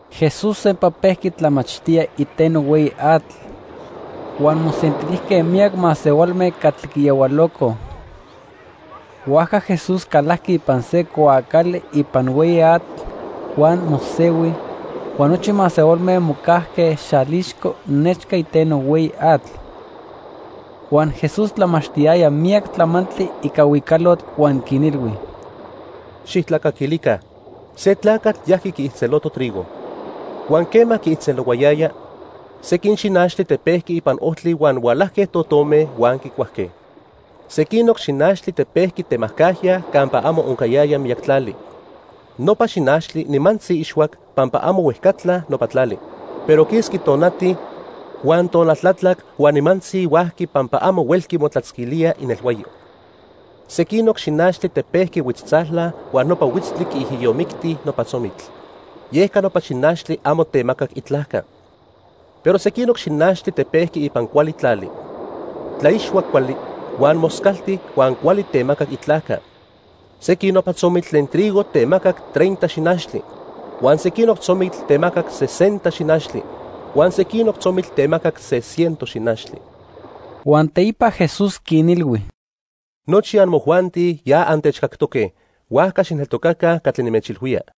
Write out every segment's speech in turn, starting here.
Jesús sempa pejqui tlamachtía iteno hueyi atl, huan mosentilijque miyac masehualme catli quiyahualocoj. Huajca Jesús calajqui ipan se cuaacali ipan hueyi atl huan mosehui, huan nochi masehualme mocajque xalixco nechca iteno hueyi atl. Huan Jesús tlamachtiyaya miyac tlamantli ica huicalotl huan quinilhui: "¡Xijtlacaquilica! Se tlacatl yajqui quiijtzeloto trigo. Huan quema quiijtzelohuayaya, sequin xinachtli tepejqui ipan ojtli huan hualajque totome huan quicuajque. Sequinoc xinachtli tepejqui temajcajya campa amo oncayaya miyac tlali. Nopa xinachtli nimantzi ixhuac pampa amo huejcatla nopa tlali. Pero quisqui tonati, huan tonal tlatlac huan nimantzi huajqui pampa amo huelqui motlatzquilía inelhuayo. Sequinoc xinachtli tepejqui huitztzala huan nopa huitztli quiijiyomicti nopa tzomitl, yeca nopa xinachtli amo temacac itlajca. Pero sequinoc xinachtli tepejqui ipan cuali tlali. Tlaixhuac cuali, huan moscalti huan cuali temacac itlajca. Sequin nopa tzomitl tlen trigo temacac treinta xinachtli, huan sequinoc tzomitl temacac sesenta xinachtli huan sequinoc tzomitl temacac se ciento xinachtli." Huan teipa Jesús quinilhui: "Nochi amojuanti ya antechcactoque. Huajca xijneltocaca catli nimechilhuía."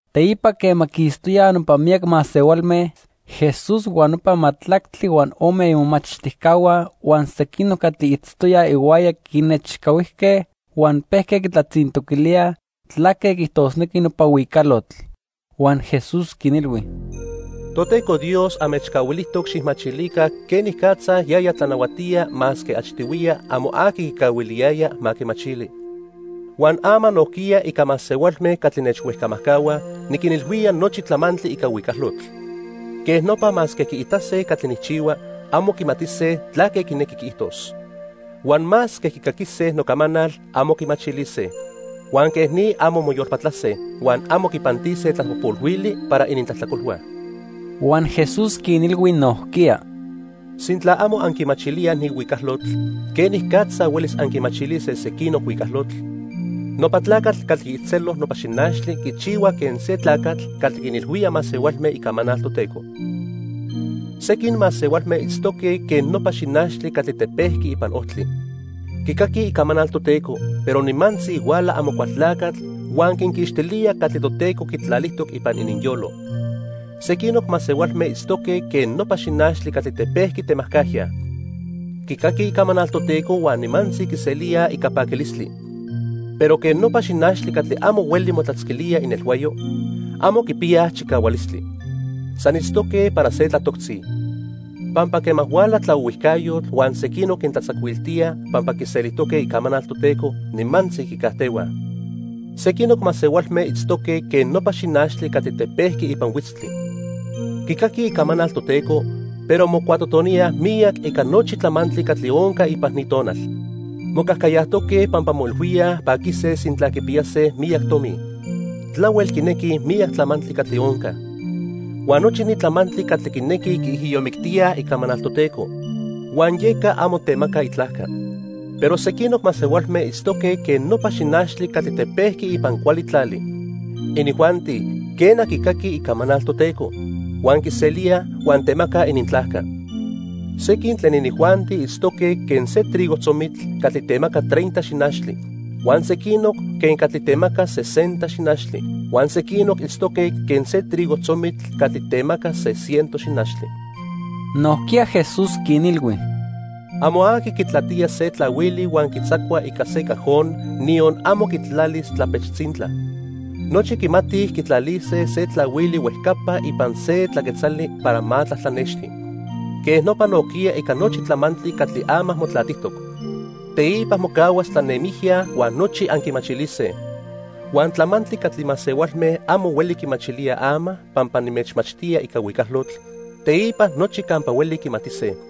Teipa quema quistoyaj nopa miyac masehualme, Jesús huan nopa majtlactli huan ome imomachtijcahua huan sequinoc catli itztoyaj ihuaya quinechcahuijque huan pejque quitlatzintoquilíaj tlaque quiijtosnequi nopa huicalotl. Huan Jesús quinilhui: "Toteco Dios anmechcahuilijtoc xijmachilica quenicatza yaya tlanahuatía masque achtihuiya amo aqui quicahuiliyaya ma quimachili. Huan ama nojquiya ica masehualme catli nechhuejcamajcahuaj, niquinilhuía nochi tlamantli ica huicalotl. Quej nopa masque quiitase catli nijchihua, amo quimatise tlaque quinequi quiijtos. Huan masque quicaquise nocamanal, amo quimachilise. Huan quej ni amo moyolpatlase, huan amo quipantise tlapojpolhuili para inintlajtlacolhua." Huan Jesús quinilhui nojquiya: "¿Sintla amo anquimachilíaj ni huicalotl, quenicatza huelis anquimachilise sequinoc huicalotl? Nopa tlacatl catli quiijtzelo nopa xinachtli quichihua quen se tlacatl catli quinilhuía masehualme icamanal Toteco. Sequin masehualme itztoque quen nopa xinachtli catli tepejqui ipan ojtli. Quicaquij icamanal Toteco, pero nimantzi huala Amocualtlacatl huan quinquixtilía catli Toteco quitlalijtoc ipan ininyolo. Sequinoc masehualme itztoque quen nopa xinachtli catli tepejqui temajcajya. Quicaquij icamanal Toteco huan nimantzi quiselíaj ica paquilistli. Pero quen nopa xinachtli catli amo hueli motlatzquilía inelhuayo, amo quipiyaj chicahualistli. San itztoque para se tlatoctzi, pampa quema huala tlaohuijcayotl huan sequinoc quintlatzacuiltíaj pampa quiselijtoque icamanal Toteco, nimantzi quicajtehuaj. Sequinoc masehualme itztoque quen nopa xinachtli catli tepejqui ipan huitztli. Quicaquij icamanal Toteco, pero mocuatotoníaj miyac ica nochi tlamantli catli onca ipan ni tonal. Mocajcayajtoque pampa moilhuíaj paquise sintla quipiyase miyac tomi. Tlahuel quinequij miyac tlamantli catli onca. Huan nochi ni tlamantli catli quinequij quiijiyomictíaj icamanal Toteco, huan yeca amo temaca itlajca. Pero sequinoc masehualme itztoque quen nopa xinachtli catli tepejqui ipan cuali tlali. Inijuanti, quena, quicaquij icamanal Toteco, huan quiselíaj huan temacaj inintlajca. Sequin tlen inijuanti itztoque quen se trigo tzomitl catli temaca treinta xinachtli, huan sequinoc quen catli temaca sesenta xinachtli, huan sequinoc itztoque quen se trigo tzomitl catli temaca se ciento xinachtli." Nojquiya Jesús quinilhui: "Amo aqui quitlatía se tlahuili huan quitzacua ica se cajon, niyon amo quitlalis tlapech tzintla. Nochi quimatij quitlalise se tlahuili huejcapa ipan se tlaquetzali para ma tlatlanexti. Quej nopa nojquiya ica nochi tlamantli catli ama motlatijtoc. Teipa mocahuas tlanemijya huan nochi anquimachilise. Huan tlamantli catli masehualme amo hueli quimachilíaj ama pampa nimechmachtía ica huicalotl, teipa nochi campa hueli quimatise.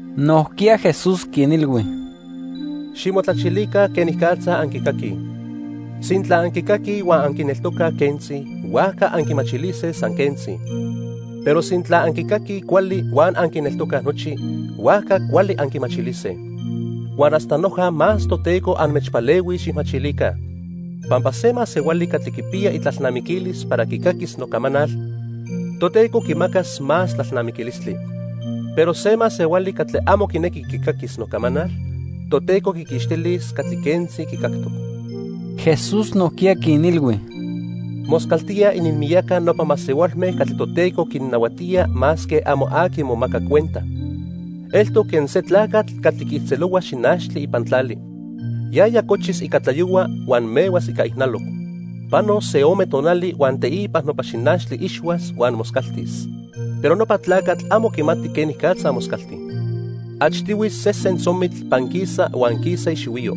Nojquiya Jesús quinilhui: "Ximotlachilica quenicatza anquicaquij. Sintla anquicaquij huan anquineltocaj quentzi, huajca anquimachilise san quentzi. Pero sintla anquicaquij cuali huan anquineltocaj nochi, huajca cuali anquimachilise. Huan hasta noja más Toteco anmechpalehuis xijmachilica. Pampa se masehuali catli quipiya itlalnamiquilis para quicaquis nocamanal, Toteco quimacas más tlalnamiquilistli. Pero se masehuali catli amo quinequi quicaquis nocamanal, Toteco quiquixtilis catli quentzi quicactoc." Jesús nojquiya quinilhui: "Moscaltía ininmiyaca nopa masehualme catli Toteco quinnahuatía masque amo aqui momaca cuenta. Eltoc quen se tlacatl catli quiijtzelohua xinachtli ipan tlali. Yaya cochis ica tlayohua huan mehuas ica ijnaloc. Panos se ome tonali huan teipa nopa xinachtli ixhuas huan moscaltis, pero nopa tlacatl amo quimati quenicatza moscalti. Achtihui sesen tzomitl panquisa huan quisa ixihuiyo.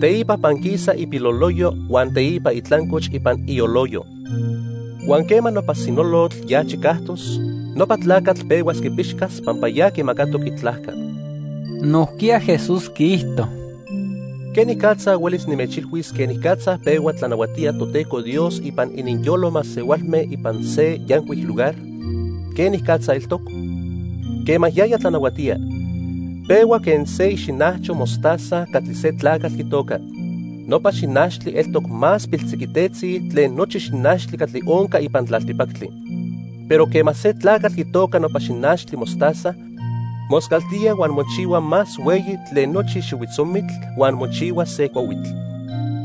Teipa panquisa ipiloloyo huan teipa itlancoch ipan ioloyo. Huan quema nopa sinolotl ya chicajtos, nopa tlacatl pehuas quipixcas pampa ya quimacatoc itlajca." Nojquiya Jesús quiijto: "¿Quenicatza huelis nimechilhuis quenicatza pehua tlanahuatía Toteco Dios ipan ininyolo masehualme ipan se yancuic lugar? ¿Quenicatza eltoc? Quema yaya tlanahuatía, pehua quen se ixinajcho mostaza catli se tlacatl quitoca. Nopa xinachtli eltoc más piltziquitetzi tlen nochi xinachtli catli onca ipan tlaltipactli. Pero quema se tlacatl quitoca nopa xinachtli mostaza, moscaltía huan mochihua más hueyi tlen nochi xihuitzomitl huan mochihuas se cuahuitl.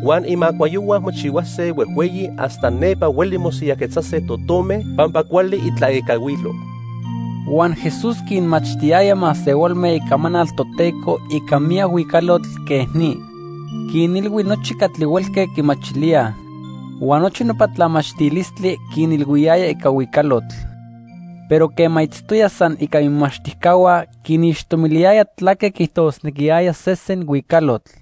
Huan imacuayohua mochihuase huejhueyi hasta nepa hueli mosiyajquetzase totome pampa cuali itlaecahuilo." Huan Jesús quinmachtiyaya masehualme icamanal Toteco ica miyac huicalotl quej ni. Quinilhui nochi catli huelque quimachilíaj. Huan nochi nopa tlamachtilistli quinilhuiyaya ica huicalotl. Pero quema itztoya san ica imomachtijcahua, quinixtomiliyaya tlaque quiijtosnequiyaya sesen huicalotl.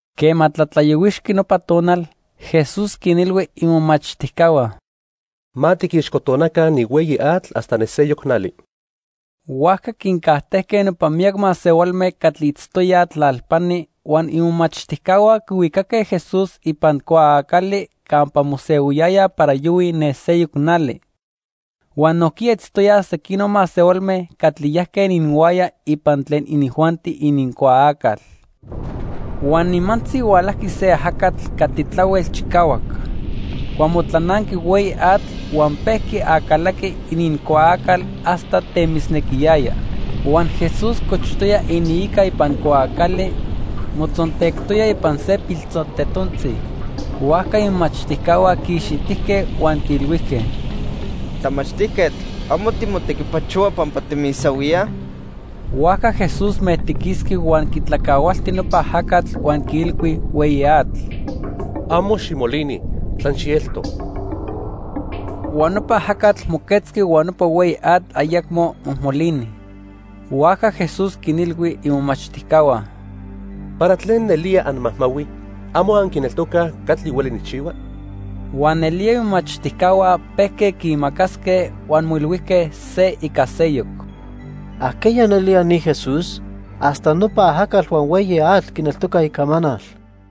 Quema tlatlayohuixqui nopa tonal, Jesús quinilhui imomachtijcahua: —Ma tiquixcotonaca ni hueyi atl hasta ne seyoc nali. Huajca quincajtejque nopa miyac masehualme catli itztoyaj tlalpani huan imomachtijcahua quihuicaque Jesús ipan cuaacali campa mosehuiyaya para yohui ne seyoc nali. Huan nojquiya itztoyaj sequinoc masehualme catli yajque ininhuaya ipan tlen inijuanti inincuaacal. Huan nimantzi hualajqui se ajacatl catli tlahuel chicahuac. Huan motlananqui hueyi atl huan pejqui acalaqui inincuaacal hasta temisnequiyaya. Huan Jesús cochtoya iniica ipan cuaacali, motzontectoya ipan se piltzontetontzi. Huajca imomachtijcahua quiixitijque huan quiilhuijque: —¡Tlamachtijquetl! ¿Amo timotequipachohua pampa timisahuíaj? Huajca Jesús mejtiquisqui huan quitlacahualti nopa ajacatl huan quiilhui hueyi atl: —Amo ximolini, san xielto. Huan nopa ajacatl moquetzqui huan nopa hueyi atl ayacmo mojmolini. Huajca Jesús quinilhui imomachtijcahua: —¿Para tlen nelía anmajmahuij? ¿Amo anquineltocaj catli hueli nijchihua? Huan nelía imomachtijcahua pejque quiimacasque huan moilhuijque se ica seyoc: —¿Ajqueya nelía ni Jesús? Hasta nopa ajacatl huan hueyi atl quineltocaj icamanal.